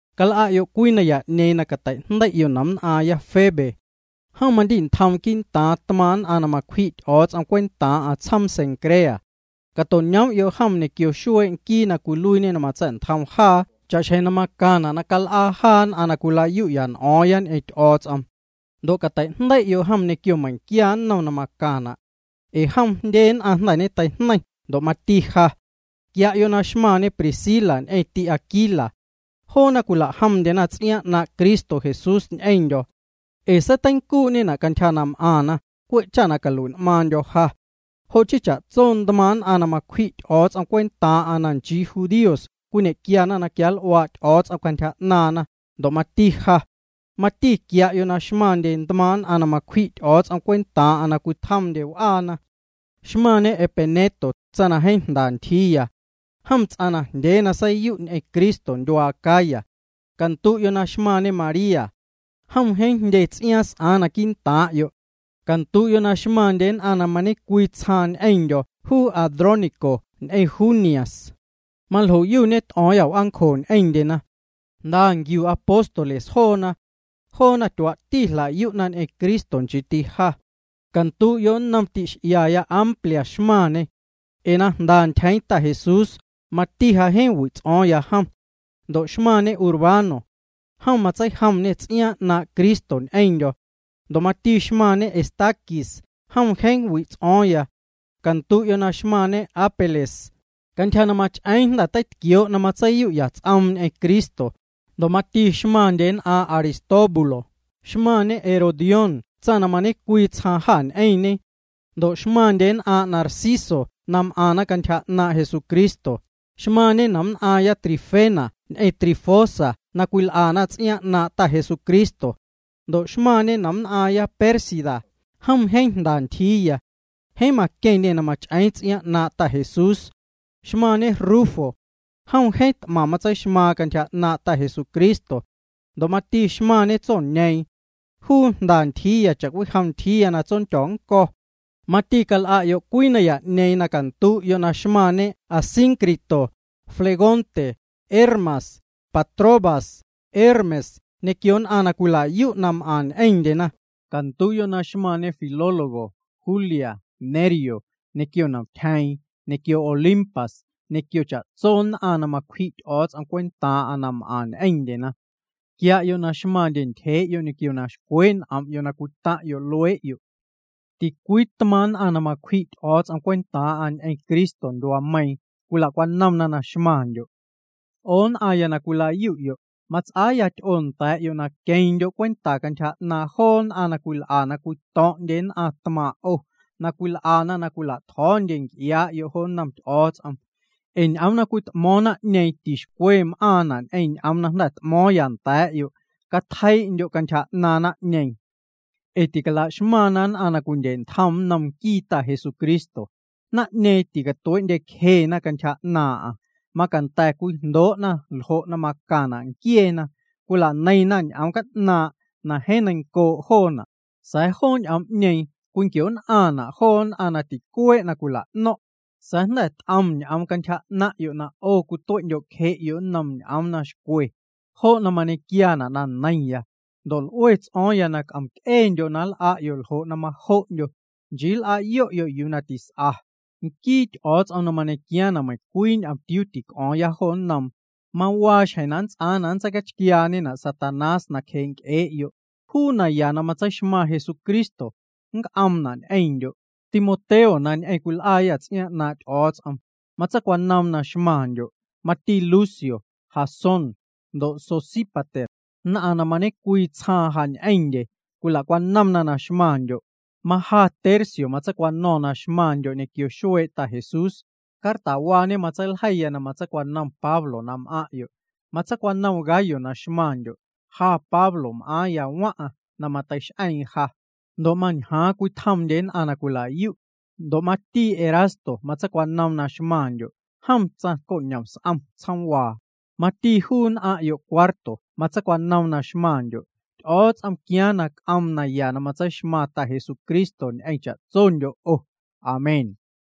Cal'a'yo' cwii naya'ñeeⁿ na cateijndei'yo' nomnn'aaⁿya Febe. Jom mandi'ntjoom quii'ntaaⁿ tmaaⁿ' nn'aⁿ na macwji' Ty'o̱o̱ts'om cwentaaⁿ'aⁿ tsjoom Cencrea. Cato'ñoom'yo' jom ñequio xuee' Nquii na cwiluiiñe na matsa̱'ntjom jaa cha'xjeⁿ na macaⁿna' na cal'aa jaa nn'aⁿ na cwilayu'ya n'o̱o̱ⁿya ñ'eⁿ Ty'o̱o̱ts'om. Ndo' catei'jndei'yo' jom ñequio meiⁿnquia nnom na macaⁿna'. Ee jom jndye nn'aⁿ jnda̱ ñeteijneiⁿ, ndo' mati ja. Quia'yo' na xmaⁿñe Priscila ñ'eⁿ ti'Aquila. Joona cwila'jomndyena ts'iaaⁿ 'naaⁿ' Cristo Jesús ñ'eⁿndyo̱. Ee seiteincuu'ñena' cantyja na m'aⁿna, cwe' cha calui'n'maaⁿndyo̱ ja. Jo' chii cha'tso ntmaaⁿ' nn'aⁿ na macwji' Ty'o̱o̱ts'om cwentaaⁿ'aⁿ na nchii judíos cwiñequia na quianl'uaa' Ty'o̱o̱ts'om cantyja 'naaⁿna, ndo' mati ja. Mati quia'yo' na xmaⁿndye tmaaⁿ' nn'aⁿ na macwji' Ty'o̱o̱ts'om cwentaaⁿ'aⁿ na cwitjomndye w'aana. Xmaⁿñe Epeneto, tsaⁿ na jeeⁿ jnda ntyjiiya. Jom ts'aⁿ najndyee na seiyu' ñ'eⁿ Cristo ndyuaa Acaya. Candu'yo' xmaⁿñe María. Jom jeeⁿ jndye ts'iaaⁿ na s'aaⁿ quii'ntaaⁿ'yo'. Candu'yo' na xmaⁿndye nn'aⁿ na ñecwii tsjaaⁿ ñ'eⁿndyo̱ juu Andrónico ñ'eⁿ Junias. Maljoyu ñet'o̱o̱ⁿya w'aancjo ñ'eⁿndyena. Jnda nquiu apóstoles joona. Joona tyuaa'ti jla'yu'na ñ'eⁿ Cristo, nchiiti ja. Candu'yo' nnom ti'x'iaya Amplias xmaⁿñê. Ee na jnda ntyjeeⁿ Ta Jesús, mati na jeeⁿ wi' ts'o̱o̱ⁿya jom. Ndo' xmaⁿñe Urbano. Jom matseijomñê ts'iaaⁿ 'naaⁿ' Cristo ñ'eⁿndyo̱. Ndo' mati xmaⁿñe Estaquis, jom jeeⁿ wi' ts'o̱o̱ⁿya. Candu'yo' na xmaⁿñe Apeles. Cantyja na mach'eeⁿ jnda̱ teitquioo' na matseiyu'ya ts'oom ñ'eⁿ Cristo. Ndo' mati xmaⁿndye nn'aaⁿ' Aristóbulo. Xmaⁿñe Herodión tsaⁿ na mañe'cwii tsjaaⁿ jâ ñ'eⁿñe. Ndo' xmaⁿndye nn'aaⁿ' Narciso na m'aⁿna cantyja 'naaⁿ' Jesucristo. Xmaⁿñe nomnn'aaⁿya Trifena ñ'eⁿ Trifosa na cwil'ana ts'iaaⁿ 'naaⁿ' Ta Jesucristo. Ndo' xmaⁿñe nomnn'aⁿya Pérsida, jom jeeⁿ jnda ntyjiiya. Jeeⁿ maqueⁿñê na mach'eeⁿ ts'iaaⁿ 'naaⁿ' Ta Jesús. Xmaⁿñe Rufo. Jom jeeⁿ t'maⁿ matseixmaaⁿ cantyja 'naaⁿ' Ta Jesucristo. Ndo' mati xmaⁿñe tsoñeeⁿ. Juu jnda ntyjiiya cha'cwijom ntyjii na tsondyo̱ nnco̱. Mati cal'a'yo' cwii naya'ñeeⁿ na candu'yo' na xmaⁿñe Asíncrito, Flegonte, Hermas, Patrobas, Hermes ñequio nn'aⁿ na cwila'yu' na m'aⁿ ñ'eⁿndyena. Candu'yo' na xmaⁿñe Filólogo, Julia, Nereo, ñequio nomtyjeeⁿ, ñequio Olimpas, ñequio cha'tso nn'aⁿ na macwji' Ty'o̱o̱ts'om cwentaaⁿ'aⁿ na m'aⁿ ñ'eⁿndyena. Quia'yo' na xmaⁿndyo' ntyjee'yo' ñequio na xcwee' n'om'yo' na cwitaⁿ'yo' luee'yo'. Ticwii tmaaⁿ' nn'aⁿ na macwji' Ty'o̱o̱ts'om cwentaaⁿ'aⁿ ñ'eⁿ Cristo ndyuaameiiⁿ cwila'cwanomna na xmaⁿndyo'. 'O nn'aⁿya na cwila'yu'yo', mats'aa ty'oo nda̱a̱'yo' na queⁿndyo' cwenta cantyja 'naaⁿ joo nn'aⁿ na cwil'a na cwito̱ⁿ'ndye nn'aⁿ tmaaⁿ' 'o, na cwil'ana na cwila'tjo̱o̱ndye nc'iaa'yo' jo nnom Ty'o̱o̱ts'om. Ee ñ'oom na cwit'mo̱o̱ⁿ naⁿ'ñeeⁿ tixcwe m'aⁿna' ñ'eⁿ ñ'oom na jnda̱ t'mo̱o̱ⁿyâ nda̱a̱'yo'. Catjei'ndyo' cantyja 'naaⁿ naⁿ'ñeeⁿ, ee ticala'xmaⁿna nn'aⁿ na cwindye'ntjom nnom nquii Ta Jesucristo. Naⁿ'ñeeⁿ ticatuee'ndyecjena cantyja 'naaⁿ'aⁿ. Macanda̱ na cwijndoo'na ljo' na macaⁿna' nquieena. Cwila'neiⁿna ñ'oom ca'naaⁿ' na jeeⁿ neiⁿncoo' joona', sa̱a̱ joo ñ'oom'ñeeⁿ cwinquio'nn'aⁿna' joo nn'aⁿ na ticuee' na cwila'no̱ⁿ'. Sa̱a̱ jnda̱ t'om ñ'oom cantyja 'naⁿ'yo' na 'o cwitue'ndyo'cje'yo' nnom ñ'oom na xcwe. Jo' na mañequiaana' na jeeⁿ neiⁿya. Ndo' l'ue ts'o̱o̱ⁿ na c'om'c'eendyo' na nl'a'yo' ljo' na majo'ndyo', nchii nl'a'yo'yo' yuu na tis'a. Nquii Ty'o̱o̱ts'om na mañequiaaⁿ na meiⁿcwii ñomtiuu tic'o̱o̱ⁿya jo nnoom, mawaa xjeⁿ na nnts'aaⁿ na nntseicachquiaañena' Satanás nacjee' nc'ee'yo'. Juu naya na tseixmaⁿ Jesucristo, c'omna' ñ'eⁿndyo'. Timoteo na ñ'eⁿ cwil'aayâ ts'iaaⁿ 'naaⁿ' Ty'o̱o̱ts'om, matseicwanoom na xmaⁿndyo'. Mati Lucio, Jasón, ndo' Sosípater, nn'aⁿ na mañecwii tsjaaⁿ ja ñ'eⁿndye cwilacwanomna na xmaⁿndyo'. Maja Tercio matseicwano̱ⁿ na xmaⁿndyo' ñequio xuee' Ta Jesús. Cartawaañe matseiljeiya na matseicwanom Pablo na m'aⁿ'yo'. Matseicwanom Gayo na xmaⁿndyo'. Ja Pablo m'aaⁿya waⁿ'aⁿ na mateix'eeⁿ ja. Ndo' mañjaaⁿ cwitjomndye nn'aⁿ na cwila'yu'. Ndo' mati Erasto matseicwanoom na xmaⁿndyo'. Jom tsaⁿcoñom s'om tsjoomwaa. Mati juu nn'aⁿya Cuarto matseicwanoom na xmaⁿndyo'. Ty'o̱o̱ts'om quiaaⁿ na c'oom naya na matseixmaⁿ Ta Jesucristo ñ'eⁿ cha'tsondyo' 'o. Amén.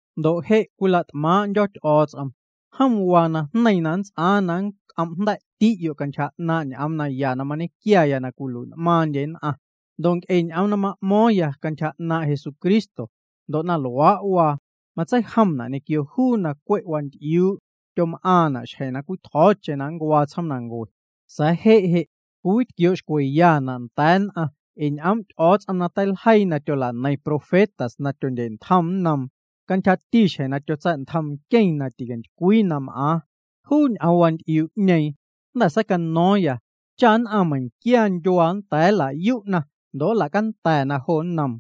Ndo' je', cwila't'maaⁿ'ndyo̱ Ty'o̱o̱ts'om. Jom waa najneiⁿ na nnts'aaⁿ na nnc'om'jnda̱'ti'yo' cantyja 'naaⁿ' ñ'oom naya na mañequiaya na cwilui'n'maaⁿndye nn'aⁿ ndo' nc'e ñ'oom na ma'mo̱o̱ⁿya cantyja 'naaⁿ' Jesucristo. Ndo' na luaa' waa, matseijomna' ñequio juu na cwe' wanty'iuu' tyom'aaⁿna' xjeⁿ cwitjo̱o̱cheⁿ na ncuaa tsjoomnancue. Sa̱a̱ je' je' cwiwitquioo' xcweyana' nda̱a̱ nn'aⁿ ee ñ'oom' Ty'o̱o̱ts'om na teiljeii na tyola'neiⁿ profetas na tyondye'ntjom nnoom, cantyjati xjeⁿ na tyotsa̱'ntjom Nqueⁿ na ticantycwii na m'aaⁿ. Juu ñ'oom waanty'iuu'ñeeⁿ jnda̱ seicano̱o̱ⁿ cha nn'aⁿ meiⁿnquia ndyuaa nnda̱a̱ nla'yu'na ndo' nla'canda̱na jo nnoom.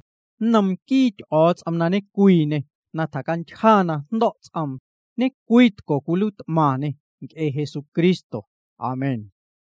Nnom nquii Ty'o̱o̱ts'om na ñecwiiñê, na tjacantyja na jndo̱' ts'oom, ñecwiitco caluiit'maⁿñê nc'e Jesucristo. Amén.